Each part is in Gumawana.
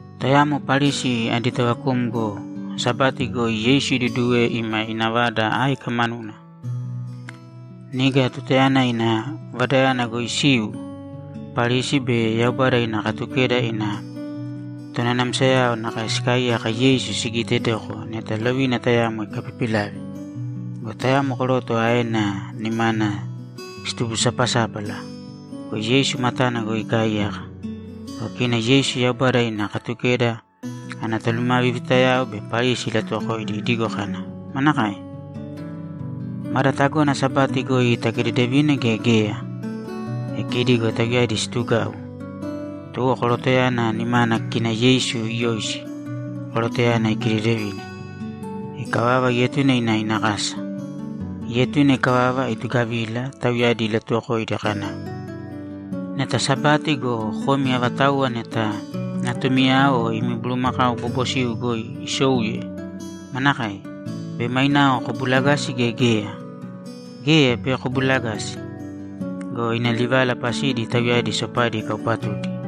Tayamo Parisi adi tovakumgo Sabati goi Yeisu iduduwe ima ina vada áika manuna. Niga tutayana ina vadayana goi isiu, Parisi be Yaubada ina Katukeda ina tonanamsayao nakae sikaaiyaka Yeisu sigiitedoko neta lovina tayamo ikapipilave. Go tayamo koroto aena nimana situbusapasápala go, Yeisu matana goi ikaaiyaka. Go kina Yeisu Yaubada ina Katukeda ana tolumavivitayao be Parisi ilatuwokoidi idigo kana, ‘Manakae? Mada tagona Sabati goi takidedevina gea geya?’ E kidi go tauyadi situgau. Tuwo korotoyana nimana kina Yeisu iyoisi, korotoyana ikidedevine. Ikavava, ietune ina ina kasa. Ietune ikavava, itugavila, tauyadi ilatuwokoidi kana, ‘Neta Sabati go, komi avatauwa neta natumi o imi bulumakau bobosiu goi isouye, manakae? Bei mainao kobulagasi, gea geya? Geya, bei kobulagasi.’ Go ina livala pasidi tauyadi sopadi ikaupatudi.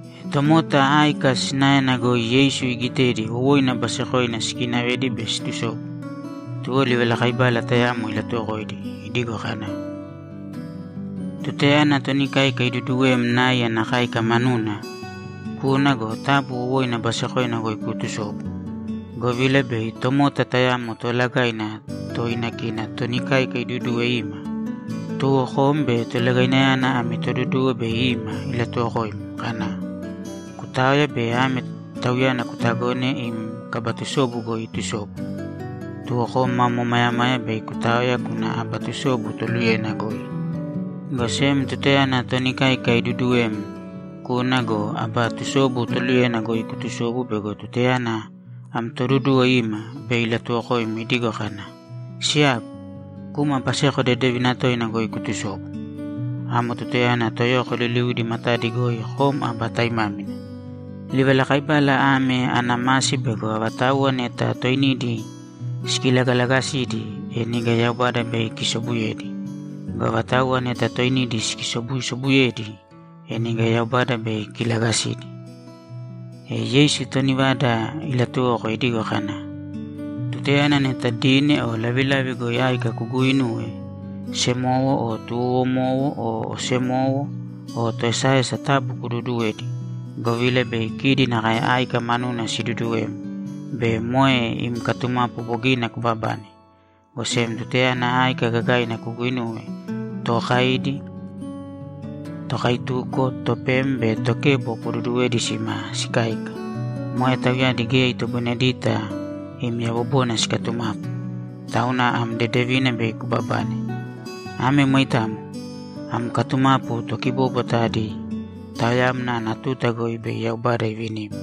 E tomota áika sinaena goi Yeisu iigitedi wowoina basekoina sikiinavedi be siitusobu, tuwo livalakaibala tayamo ilatuwokoidi idigo kana, ‘Tutayana toni káika iduduwem nai ana káika manuna, kūna go, taabu wowoina basekoina goi kuutusōbu, govila bei tomota tayamo toolagaina toina kina toni káika iduduwe ima. Tuwo kom be tolagainayana ami toduduwo bei ima ilatuwokoim kana, “Kutāoya bei ame tauyana kutagōne im kaba tusobu goi itusobu.” Tuwo kom mam omayamaya bei kutaoya kuna aba tusobu toluyena goi. Go sem tutayana toni káika iduduwem, kūna go, aba tusobu toluyena goi kutusōbu bego tutayana am toduduwo ima, bei ilatuwokoim idigo kana, “Siyagu, kūma baseko dedevina toina goi kutusōbu.” Amo tutayana toyoko liliudi matadi goi kom aba taimámina. Livalakaibala ame ana masi bego avatauwa neta toinidi sikilagalagasidi, e niga Yaubada bei ikisobuyedi. Go avatauwa neta toinidi sikisobusobuyedi, e niga Yaubada bei ikilagasidi.’ E Yeisu toni vada ilatuwoko idigo kana, ‘Tutayana neta dine o lavilavi goi áika kuguinuwe, semowo o tuwowomowo o osemowo o toesaesa taabu kuduuduwēdi, govila bei kidi nakae áika manuna siduduwem be moe im katumapu bogina kubabane. Go sem tutayana áika gagaina kuguinuwe, tookaidi, tokaituko, topem be tokebo kududuwēdi sima sikáika. Moe tauyadi geya itoboinedita im yabobona sikatumapu, tauna am dedevina bei kubabane. Ame moitamo. Am katumapu tokibóbwata adi taoyamna ana tuta goi bei Yaubada ivinim.’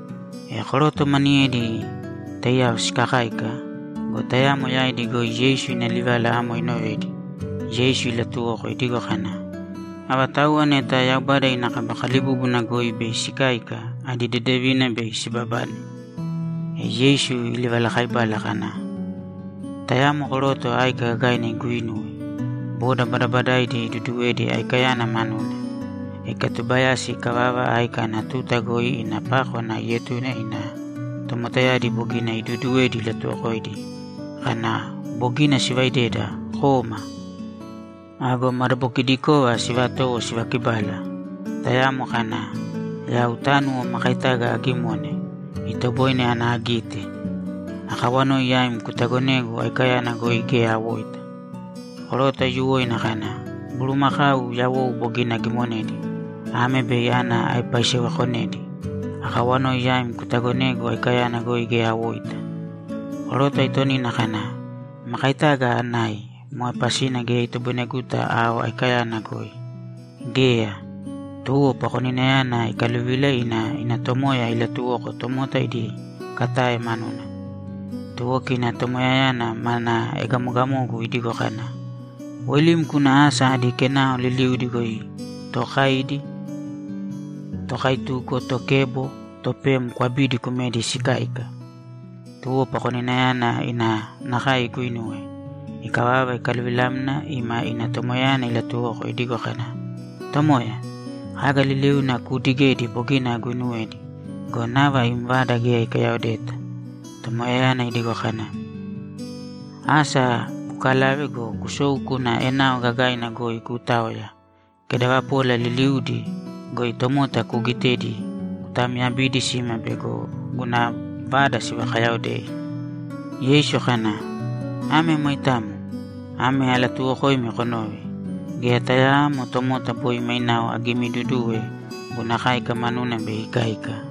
E koroto maniyedi taiyao sikakáika go, tayamo yaidi goi Yeisu ina livala amo inovedi, Yeisu ilatuwoko idigo kana, ‘Avatauwa neta Yaubada ina kaba kalibúbuna goi bei sikáika, adi dedevina bei sibabane!’ E Yeisu ilivalakaibala kana, ‘Tayamo koroto áika gagaina iguuinuwe. Boda badabadaidi iduduwedi aikayana manuna. Ikatubayasi ikavava, áika ana tuta goi ina pákwana ietune ina tomotayadi bogina iduuduwedi ilatuwokoidi kana, “Bogina sivaideda, kōma!” Ago madabokidikova sivatowo sivakibala. Tayamo kana, “Yau tánuwo makaitaga agimone, itoboine ana agite. Akawanoi yaim kutagonēgu aikayana goi geya awoita.” Koroto aiyuwoina kana, “Bulumakau yawou bogina agimonedi. Ame bei ana aepaisewekonedi. Akawanoi yaim kutagonēgu aikayana goi geya awoita.” Koroto aitonina kana, “Makaitaga anai. Moe pasina geya itoboineguta ao aikayana goi.” Geya, tuwo pakoninayana ikaluvila ina ina tomoya ilatuwoko tomota idi katae manuna. Tuwo kina tomoyayana mana egamogamogu idigo kana, “Woilīm kūna asa adi kenao liliudi goi tookaidi, tokaituko, tokebo, topem kwabīdi kumēdi sikáika!” Tuwo pakoninayana ina nakae iguinuwe. Ikavava, ikaluvilamna ima ina tomoyayana ilatuwoko idigo kana, “Tomoya, kaga liliuna kuudigedi bogina aguinuwedi go, nava im vada geya ikayaodeta.” Tomoyayana idigo kana, “Asa kukalāve go, kusōu kūna enao gagaina goi kuutāoya, kedavapola liliudi goi tomota kuugitedi kutamyabīdi sima bego guna vada sivakayaodei!”’ Yeisu kana, ‘Ame moitamo. Ame alatuuwokoimi konōve: Geya tayaamo tomota boi mainao agimiiduduwe guna káika manuna bei ikáika.’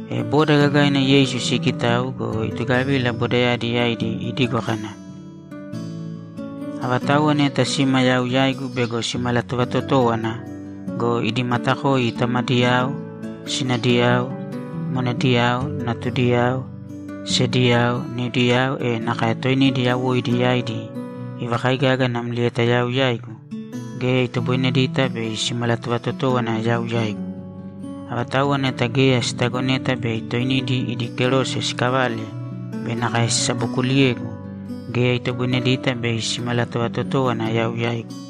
E boda gagaina Yeisu siikitau go, itugavila bodayadi yaidi idigo kana, ‘Avatauwa neta sima yau yaigu bego simalatovatotówana go, idi matakoi tamadiyao, sinadiyao, monediyao, natudiyao, sediyao, niudiyao, e nakae toinidi yawoidi yaidi ivakaigaga namlieta yau yaigu, geya itoboinedita bei simalatovatotówana yau yaigu. Avatauwa neta geya sitagoneta bei toinidi idi kerose sikavale be nakae sisabokuliyegu, geya itoboinedita bei simalatovatotówana yau yaigu.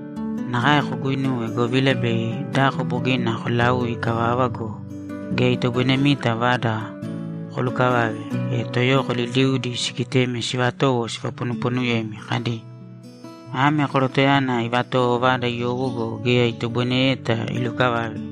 Nakae koguinuwe, govila bei dako bogina kolaui ikavava go, geya itoboinemita vada kolukavave, e toyoko liliudi sigitemi sivatowo sivaponuponuyemi kadi, “Ame korotoyana ivatowo vada iyowo go, geya itoboineyeta ilukavave.”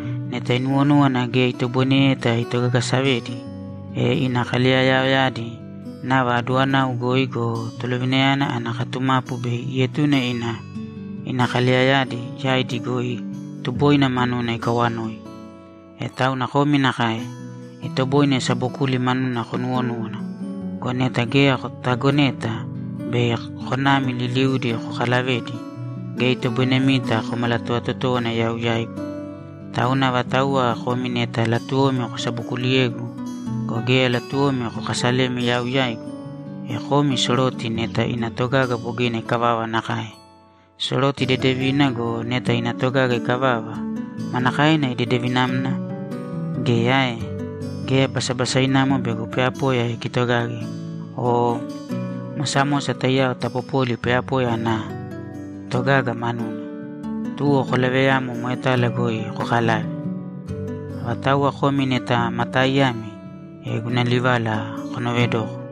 Neta inuwonúwana geya itoboineyeta itogagasavedi, e ina kaleyayaoyadi nava aduwanau goi go, tolovinayana ana katumapu bei ietune ina ina kaleyayadi yaidi goi tuboina manuna ikawanoi. E tauna komi nakae. Itoboine sabokuli manuna konuwonúwana. Go neta geya kotagoneta bei konami liliudi kokalavedi, geya itoboinemita komalatovatotówana yau yaigu. Tauna avatauwa komi neta latuwomi kosabokuliyegu go, geya latuwomi kokasalemi yau yaigu, e komi soroti neta ina togaga bogina ikavava nakae. Soroti dedevina go, neta ina togaga ikavava, manakaena idedevinamna? Geya ae? Geya basabasainamo bego poyapoya ikitogage o mosamosa taiyao tapopoli poyapoya ana togaga manuna. Tuwo kolaveyāmo moetala goi kokalāve. Avatauwa komi neta ma taaiyami, e guna livala konoovedōko.’